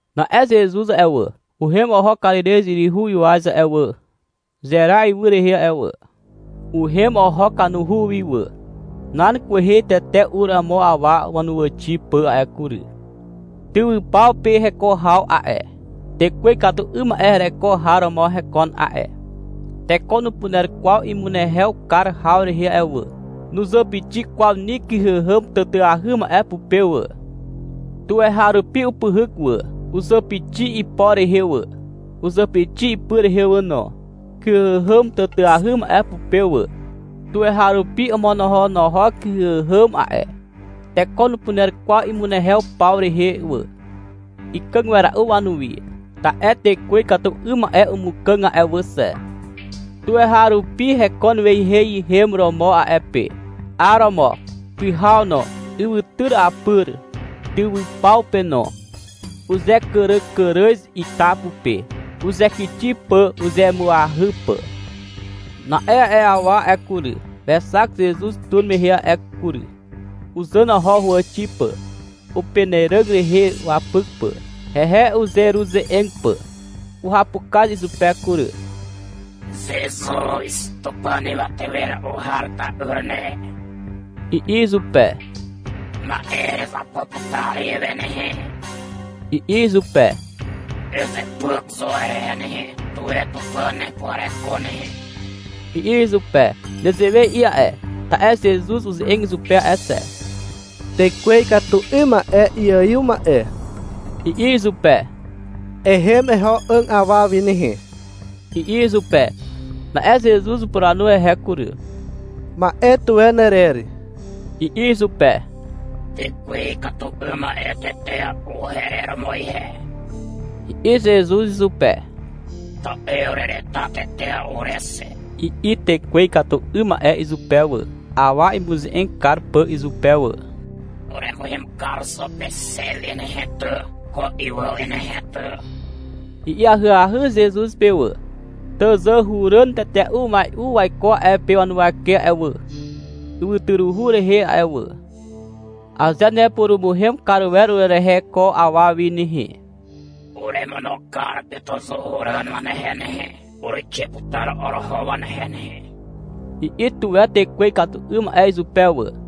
Na'e Zezuz a'e wà, uhem oho Karirez yryhu ywaz a'e wà, Zera ywy rehe a'e wà. Uhem oho kanuhu wi wà. Nan kwehe tete ur amo awa wanuwàxi pà a'e kury. Tywypaw pe heko haw a'e. Tekwe ikatu 'ym ma'e hereko har romo hekon a'e. Teko nupuner kwaw imunehew kar haw rehe a'e wà, nuzàpixi kwaw ni kyhàhàm tàtàahy ma'e pupe wà. Tuweharupi upyhyk wà. Uzàpixi ipo rehe wà, uzàpixi ipy rehe wà no, kyhàhàm tàtàahy ma'e pupe wà. Tuweharupi omonohonohok kyhàhàm a'e. Teko nupuner kwaw imunehew paw rehe wà. Ikàg wera'u wanuwi (ta'e tekwe ikatu 'ym ma'e umukàg a'e wà xe). Tuweharupi hekon weiheihem romo a'e pe, 'ar romo, pyhaw no, ywytyr apyr, tywypaw pe no. Uzekàràkàràz ita pupe, uzekixi pà uzemuahy pà. Na'e a'e awa a'e kury, wexak Zezuz tur mehe a'e kury. Uzàn oho huwàxi pà, upenàràg rehe wapyk pà, hehe uzeruze'eg pà. Uhapukaz izupe kury. — Zezuz, Tupàn Ywate Wera'u Har ta'yr ne, i'i izupe. — Ma'e erezapo putar ihewe nehe, i'i izupe. — Ezepyk zo herehe nehe, tuwe Tupàn hepuhareko nehe, i'i izupe. Nezewe i'i a'e, ta'e Zezuz uze'eg izupe a'e xe. — Tekwe ikatu 'ym ma'e iaiw ma'e, i'i izupe. — Ehem eho 'àg awa wi nehe, i'i izupe. Na'e Zezuz upuranu hehe kury. — Ma'e tuwe nerer, i'i izupe. — Tekwe ikatu 'ym ma'e tetea'u herer romo ihe, i'i Zezuz izupe. — Ta'e urereta tetea'u ure xe, i'i tekwe ikatu 'ym ma'e izupe wà, awa imuze'eg kar pà izupe wà. — Uremuhem kar zo pe xe wi nehe ty, ko ywy wi nehe ty, i'i ahyahy Zezuz pe wà. Tàzàhuràn tetea'u umai'u waiko a'e pe wanuwake a'e wà, ywytyruhu rehe a'e wà. — Aze nepurumuhem kar wer urerehe ko awa wi nehe, uremono kar pe tàzàhuràn wanehe nehe. Uruixe putar oroho wanehe nehe, i'i tuwe tekwe ikatu 'ym ma'e izupe wà.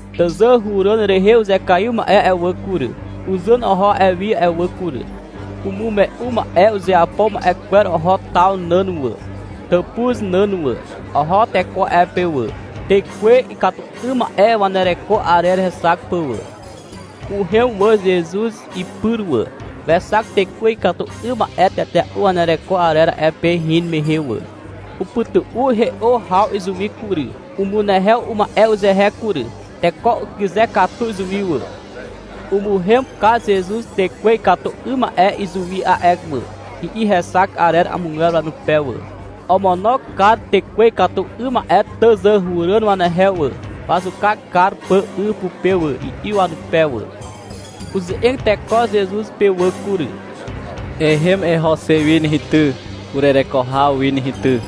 Tàzàhuràn rehe uzekaiw ma'e a'e wà kury, uzàn oho a'e wi a'e wà kury. Umume'u ma'e uzeapo ma'e kwer oho taw nàn wà, tàpuz nàn wà. Oho teko a'e pe wà, tekwe ikatu 'ym ma'e wanereko arer hexak pà wà. Uhem wà Zezuz ipyr wà. Wexak tekwe ikatu 'ym ma'e tetea'u wanereko arer a'e pe hin mehe wà. Upytu'u he'o haw izuwi kury. Umunehew uma'e uzehe kury. Teko ukyze katu izuwi wà. — Umuhem kar Zezuz tekwe ikatu 'ym ma'e izuwi a'e wà, i'i hexak arer amogwer wanupe wà. — Omono kar tekwe ikatu 'ym ma'e tàzàhuràn wanehe wà, wazuka kar pà 'y pupe wà, i'i wanupe wà. Uze'eg teko Zezuz pe wà kury. — Ehem eho xe wi nehe ty, urereko haw wi nehe ty,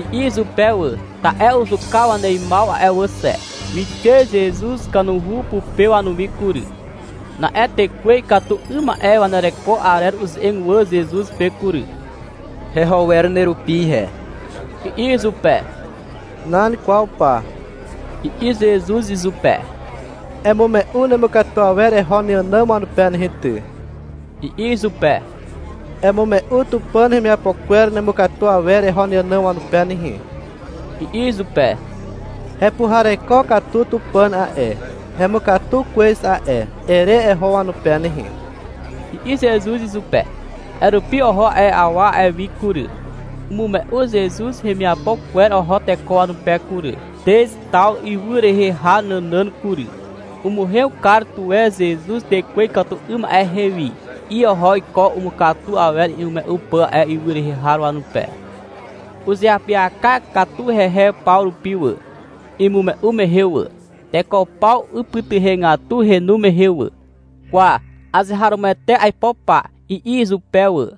i'i izupe wà. (Ta'e uzuka waneimaw a'e wà xe.) Wixe Zezuz kanuhu pupe wanuwi kury. Na'e tekwe ikatu 'ym ma'e wanereko arer uze'eg wà Zezuz pe kury. — Heho wer nerupi ihe, i'i izupe. — Nan kwaw pa, i'i Zezuz izupe. — Emume'u nemukatu awer eho neànàm wanupe nehe ty, i'i izupe. — Emume'u Tupàn hemiapo kwer nemukatu awer eho neànàm wanupe nehe, i'i izupe. — Hepuhareko katu Tupàn a'e, hemukatu kwez a'e, ere eho wanupe nehe, i'i Zezuz izupe. A'e rupi oho a'e awa a'e wi kury. Umume'u Zezuz hemiapo kwer oho teko wanupe kury, Teztaw ywy rehe har nànàn kury. — Umuhem kar tuwe Zezuz tekwe ikatu 'ym ma'e hewi, i'i oho iko umukatu awer imume'u pà a'e ywy rehe har wanupe. Uzeapyaka katu hehe paw rupi wà, imume'u mehe wà. Teko paw ipytuhegatu henu mehe wà. — Kwa, azeharomoete aipo pa, i'i izupe wà.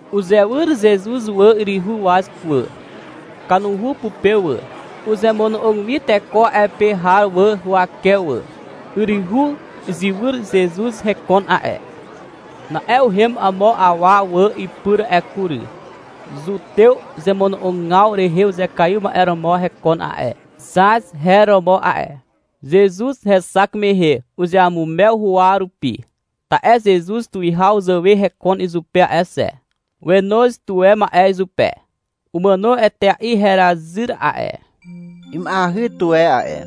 Uzewyr Zezuz wà yryhu waz wà, kanuhu pupe wà. Uzemono'og wi teko a'e pe har wà huwake wà. Yryhu izywyr Zezuz hekon a'e. Na'e uhem amo awa wà ipyr a'e kury. Zutew zemono'ogaw rehe uzekaiw ma'e romo hekon a'e. Zaz her romo a'e. Zezuz hexak mehe, uzeamumew huwa rupi, (ta'e Zezuz tuwihaw zàwe hekon izupe a'e xe). Wenoz tuwe ma'e izupe. — Umàno etea'i herazyr a'e, ima'eahy tuwe a'e,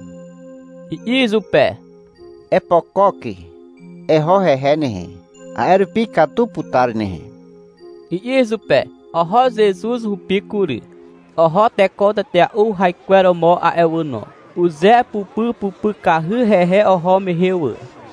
i'i izupe. — Epokok eho hehe nehe. A'e rupi ikatu putar nehe, i'i izupe. Oho Zezuz hupi kury. Oho teko tetea'u haikweromo a'e wà no. Uzepupypupykahy hehe oho mehe wà.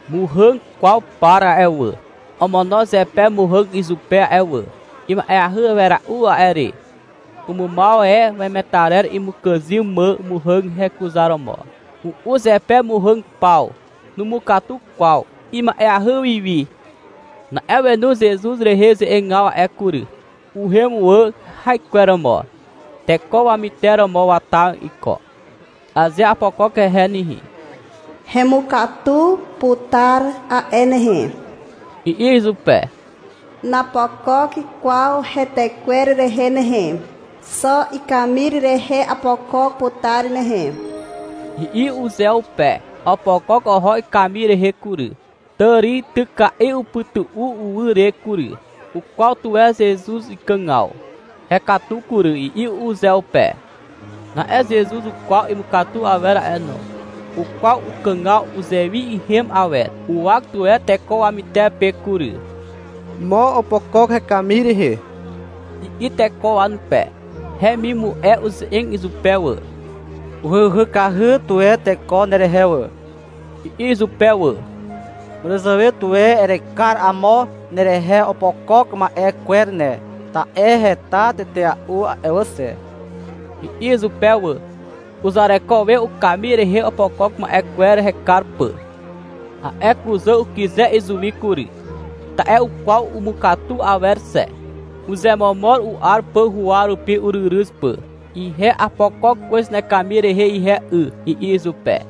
Muhàg kwaw par a'e wà, omono zepe muhàg izupe a'e wà. Ima'eahy wera'u a'e re. Umumaw e wemetarer imukàzym mà muhàg hekuzaromo. U'u zepe muhàg paw. Numukatu kwaw. Ima'eahy wi wi. Na'e wenu Zezuz rehe ze'egaw a'e kury. Uhem wà haikweromo. Teko wamyteromo wata iko. — Aze apokok hehe nehe, hemukatu putar a'e nehe, i'i uzeupe. — Napokok kwaw hetekwer rehe nehe, xo ikamir rehe apokok putar nehe, i'i uzeupe. Opokok oho ikamir rehe kury. Tàrityka'i upytu'u uwy re kury. Ukwaw tuwe Zezuz ikàgaw. (— Hekatu kury, i'i uzeupe.) Na'e Zezuz ukwaw imukatu awer a'e no. Ukwaw ukàgaw uzewi ihem awer. Uwak tuwe teko wamytepe kury. — Mo opokok hekamir rehe, i'i teko wanupe. Hemimu'e uze'eg izupe wà. — Uhyuhykahy tuwe teko nerehe wà, i'i izupe wà. — Màràzàwe tuwe erekar amo nerehe opokok ma'e kwer ne, ta'e heta tetea'u a'e wà xe, i'i izupe wà. Uzareko we ukamir rehe opokok ma'e kwer hekar pà. A'e kuzà ukyze izuwi kury, ta'e ukwaw umukatu awer xe. Uzemomor u'ar pà huwa rupi uryryz pà. — Ihe apokok kwez nekamir rehe ihe 'y, i'i izupe.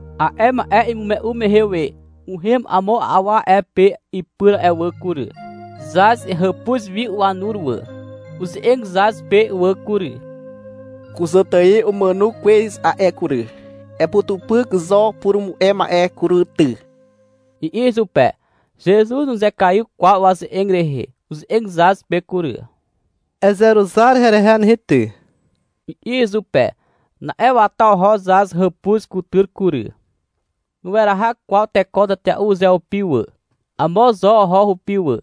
A'e ma'e imume'u mehe we, uhem amo awa a'e pe ipyr a'e wà kury. Zaz hàpuz wi wanur wà. Uze'eg Zaz pe wà kury, — Kuzàtài umàno kwez a'e kury. Eputupyk zo purumu'e ma'e kury ty, i'i izupe. Zezuz nuzekaiw kwaw waze'eg rehe. Uze'eg Zaz pe kury. — Ezeruzar herehe nehe ty, i'i izupe. (Na'e wata oho Zaz hàpuz kutyr kury.) Nueraha kwaw teko tetea'u uzeupi wà. Amo zo oho hupi wà,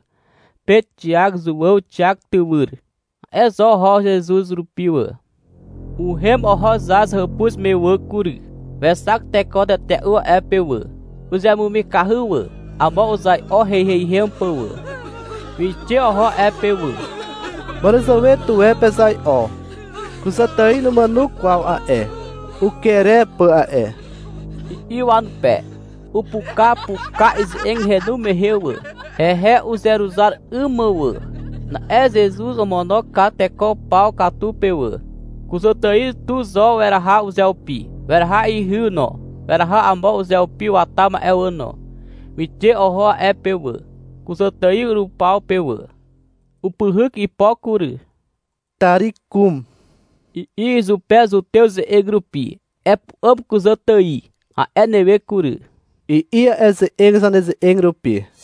Pet, Xiak, Zuàw Xiak tywyr. A'e zo oho Zezuz rupi wà. Uhem oho Zaz hàpuz me wà kury. Wexak teko tetea'u a'e pe wà. Uzemumikahy wà. Amo uzai'o heiheihem pà wà. Wixe oho a'e pe wà. — Màràzàwe tuwe pezai'o. Kuzàtài numàno kwaw a'e. Uker e pà a'e, i'i wanupe. Upukapuka ize'eg henu mehe wà, (hehe uzeruzar 'ym mà wà). Na'e Zezuz omono kar teko paw katu pe wà. Kuzàtài tu zo weraha uzeupi. Weraha ihy no, weraha amo uzeupi wata ma'e wà no. Wixe oho a'e pe wà, kuzàtài rupaw pe wà. Upyhyk ipo kury. — Tari kum, i'i izupe Zutew ze'eg rupi. — Epu'àm kuzàtài, a'e newe kury, i'i a'e ze'eg zaneze'eg rupi.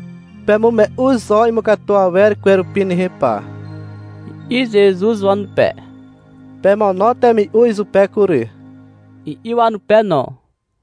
— Pemume'u zo imukatu awer kwerupi nehe pa, i'i Zezuz wanupe. — Pemono temi'u izupe kury, i'i wanupe no.